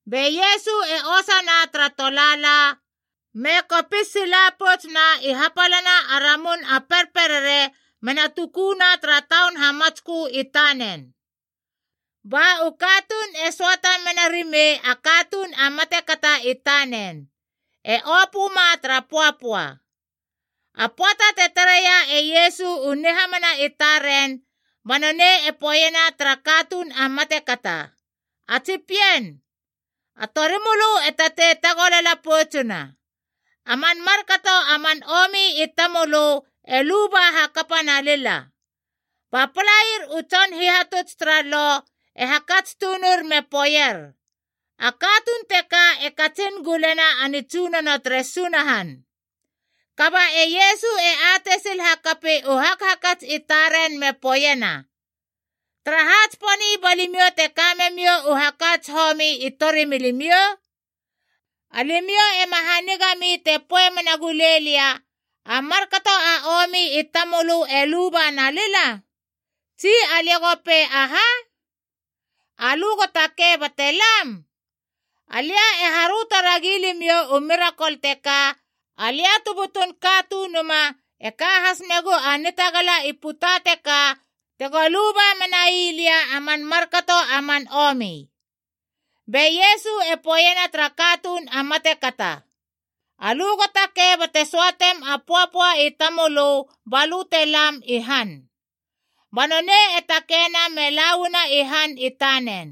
Be Iesu e osana tara tolaala, me kopis sila poutsuna i hapalana a ramun a perperere mena tukuna tara taun hamatskö i tanen. Ba u katuun e söata menarimei a katuun a matekata i tanen, e opöma tara pöapöa. A pöata te tareia e Iesu u nihamana i taren, ba nonei e poeiena tara katuun a matekata, “A tsi pien, a torimölö e tatei tagolala poutsuna. A man markato a man omi i tamölö e luba hakapa nalila.” Ba palair u tson hihatuts tara Lo e hakats tunur me poeier, “A katuun teka e katsin gulena a nitsunono tere Sunahan.” Kaba e Iesu e atei sil hakapi u hakhakats i taren me poeiena, “Taraha tsiponi ba limiou te ka memiou u hakats homi i torimilimiou? Alimiou ema hanigami te poei mena gulei lia, ‘A markato a omi i tamölö e luba nalila?’ Tsi alia go pei aha? ‘Alö go takei bate lam?’ Alia e haröto ragi limiou u mirakol teka, alia tu butun Katunuma e ka has megu a nitagala i puta teka tego luba menai lia a man markato a man omi.” Be Iesu e poeiena tara katuun a matekata, “Alö go takei bate söatem a pöapöa i tamölö ba lö te lam i han.” Ba nonei e takeina me lauana i han i tanen.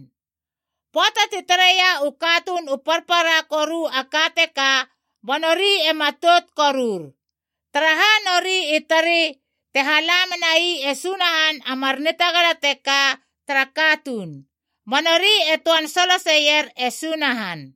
Pöata ti tareia u katuun u parpara koru a ka teka ba nori e matout korur. Taraha nori i tari te hala menai e Sunahan a mar nitagala teka tara katuun, ba nori e töan soloseier e Sunahan.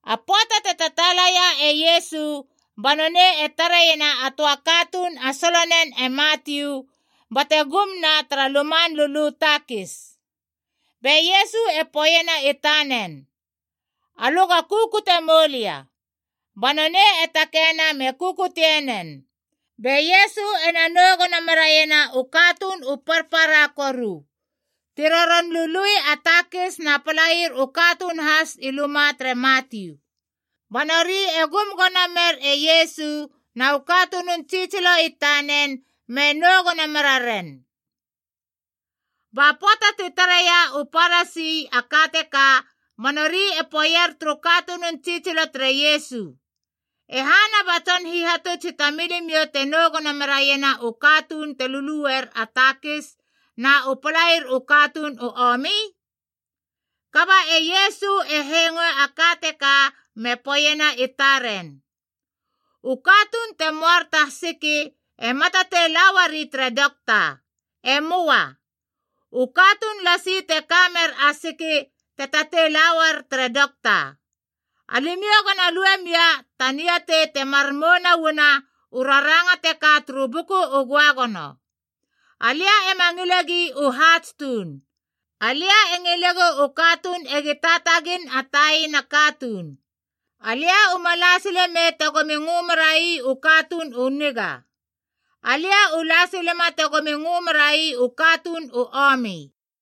A pöata te tataalaia e Iesu ba nonei e tareiena a töa katuun a solonen e Matiu bate gumna tara luman lulu takis. Be Iesu e poeiena i tanen, “Alö go kukutie mou lia.” Ba nonei e takeina me kukutienen. Be Iesu ena nou gono meraiena u katuun u parpara koru ti ron lului a takis na palair u katuun has i luma tere Matiu. Ba nori e gum gono mer e Iesu na u katunun tsitsilo i tanen me nou gono meraren. Ba pöata ti tareia u Parasi a ka teka ba nori e poeier turu katunun tsitsilo tere Iesu, “E hana ba Tson Hihatuts i tamilimiou te nou gono meraiena u katuun te luluer a takis na u palair u katuun u omi?” Kaba e Iesu e hengoe a ka teka me poeiena i taren, “U katuun te moar ta siki ema tatei la uari tere dokta. E möa. U katuun lasi te ka mer a siki te tatei la uar tere dokta. Alimiou gona lue mia ta niatei temar mouna uana u raranga teka turu Buku u Göagono: ‘Alia ema ngilegi u haats tuun. Alia e ngilegu u katuun egi taatagin a taina katuun.’ Alia uma la silemei tegomi ngö merai u katuun u niga. Alia u la silema tegomi ngö merai u katuun u omi.”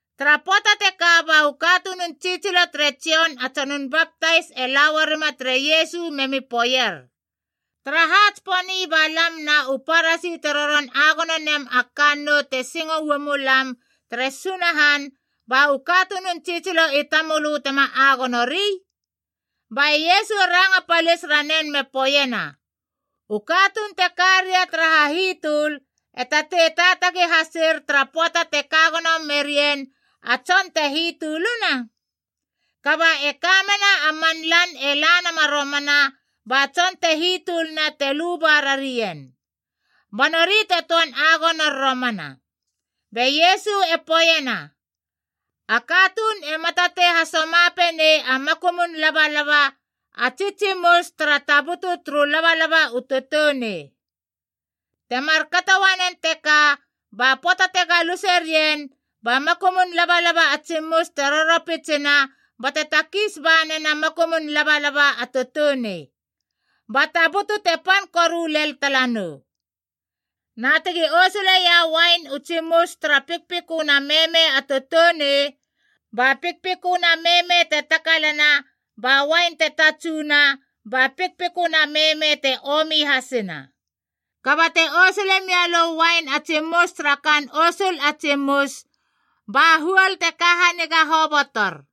Tara pöata teka ba u katunun tsitsilo tere Jon a Tsonun Baptais e la uarima tere Iesu memi poeier, “Taraha tsiponi ba lam na u Parasi te roron agono nem a kannou te singo uamulam tere Sunahan, ba u katunun tsitsilo i tamölö tema agonori?” Ba e Iesu e ranga palis ranen me poeiena, “U katuun te karia tara hahitöl, e tatei taatagi hasir tara pöata te kagono merien a tson te hitöluna? Kaba e kamena a man lan e la nama romana ba tson te hitöluna te luba rarien. Ba nori te töan agonor romana.” Be Iesu e poeiena, “A katuun ema tatei hasamapenei a makumun labalaba a tsi tsimus tara tabutu turu labalaba u toutounei. Te markato uanen teka ba pöata te galuse rien ba makumun labalaba a tsimus te roropitsina bate takis ba nena a makumun labalaba a toutounei, ba tabutu te pan koru len talanou. Na tegi osuleia uain u tsimus tara pikpiköna meme a toutounei. Ba pikpiköna meme te takalana ba uain te tatsuna ba pikpiköna meme te omi hasina. Kaba te osule mialö a uain a tsimus tara kaan osul a tsimus, ba huol te ka haniga habotor.”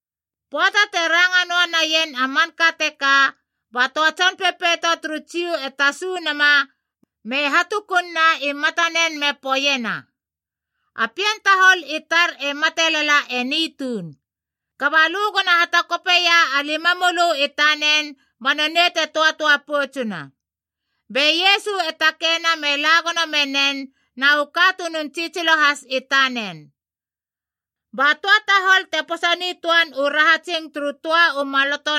Pöata te ranga noa naien a manka teka, ba töa tson pepeito turu Jiu e tasu nama me hatukunna i matanen me poeiena, “A pien tahol i tar e mate lala eni tuun. Kaba lö gona hatakopeia a limamölö i tanen ba nonei te töatöa poutsuna.” Be Iesu e takeina me la gono menen na u katunun tsitsilo has i tanen. Ba töa tahol te posa nitöan u rahatsing turu töa u maloto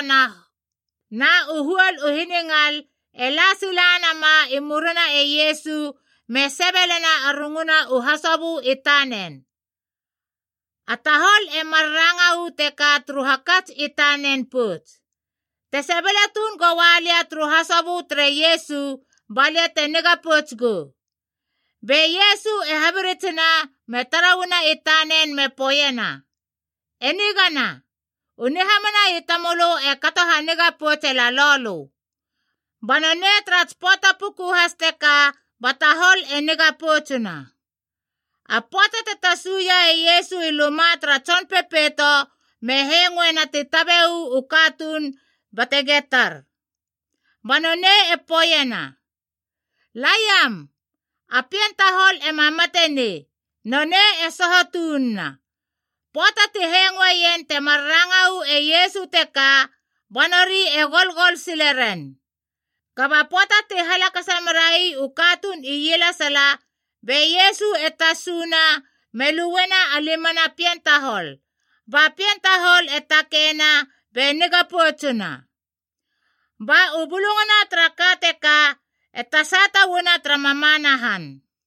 na u huol u hiningal e la silanama i murina e Iesu me sebelena a runguna u hasobö i tanen. A tahol e mar ranga uu teka turu hakats i tanen pouts, “Te sebele tuun goua lia turu hasobö tere Iesu balia te niga pouts gou.” Be Iesu e habiritsina me tara uana i tanen me poeiena, “E nigana, u nihamana i tamölö e kato haniga poutse lalou lö.” Ba nonei tara tsi pöata puku has teka ba tahol e niga poutsuna. A pöata te tasuia e Iesu i luma tara tson pepeito me hengoena ti tabe uu katuun bate getar. Ba nonei e poeiena, “Laiam. A pien tahol ema mate nei. Nonei e soho tununa.” Pöata ti hengoeien temar ranga uu e Iesu teka, ba nori e golgol sileren. Kaba pöata ti halakasa merai u katuun ielesala, be Iesu e tasuna me luena a limana pien tahol, ba pien tahol e takeina be niga poutsuna. Ba u bulungana tara ka teka e tasata uana tara mamana han.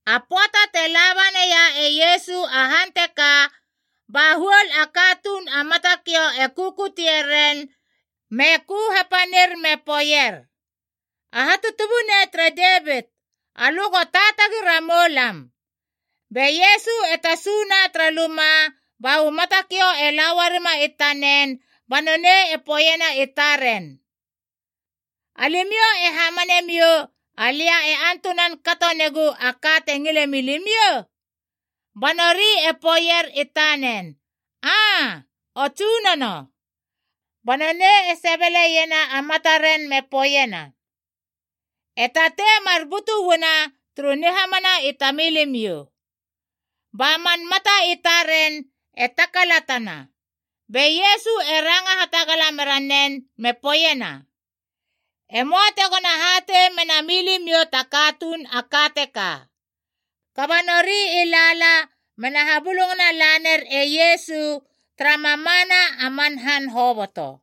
A pöata te la ba naia e Iesu a han teka, ba huol a katuun a matakiou e kukutie ren me ku hapanir me poeier, “A Hatutubunei tere Devit alö go taatagi ramou lam!” Be Iesu e tasuna tara luma ba u matakiou e la uarima i tanen ba nonei e poeiena i taren, “Alimiou e hamanemiou, alia e antunan kato negu a ka te ngile milimiou?” Ba nori e poeier i tanen, “Aa, O Tsunono.” Ba nonei e sebeleiena a mataren me poeiena, “E tatei mar butu uana turu nihamana i tamilimiou.” Ba man mata i taren e takalatana! Be Iesu e ranga hatagala mera nen me poeiena, “E möa tegona hatei mena milimiou ta katuun a ka teka!” Kaba nori i lala mena habulungana laner e Iesu tara mamana a man han hoboto.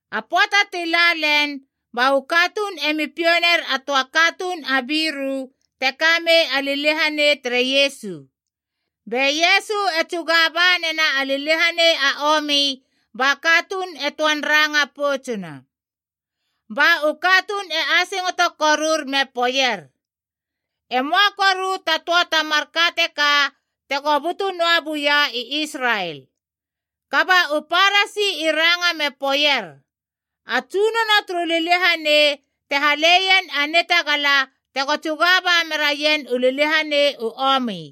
A pöata ti lalen, ba u katuun emi piou ner a töa katuun a biru te kamei a liliahanei, tere Iesu. Be Iesu e tsuga ba nena a liliahanei a omi ba katuun e töan ranga poutsuna. Ba u katuun e asingoto korur me poeier, “E möa koru ta töa ta marka teka tego butu noa buia i Israel!” Kaba u Parasi i ranga me poeier, “A tsunono turu liliahanei te haleien a nitagala tego tsuga ba meraien u liliahanei u omi!”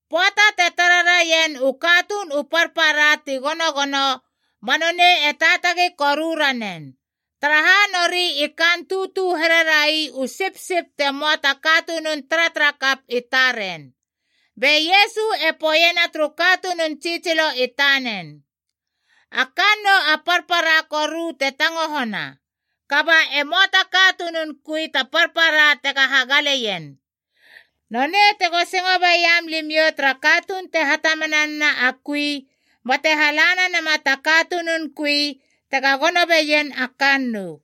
Pöata te tara raien u katuun u parpara ti gonogono, ba nonei te taatagi koru ranen, taraha nori i kaan tutu here rai u sipsip te möa ta katunun taratarakap i taren. Be Iesu e poeiena turu katunun tsitsilo i tanen, “A kannou a parpara koru te tangohona, kaba e möa ta katunun kui ta parpara tega hagaleien. Nonei tego singo beiam limiou tara katuun te hatamana nena a kui, bate halane nama ta katunun kui tega gono beien a kannou.”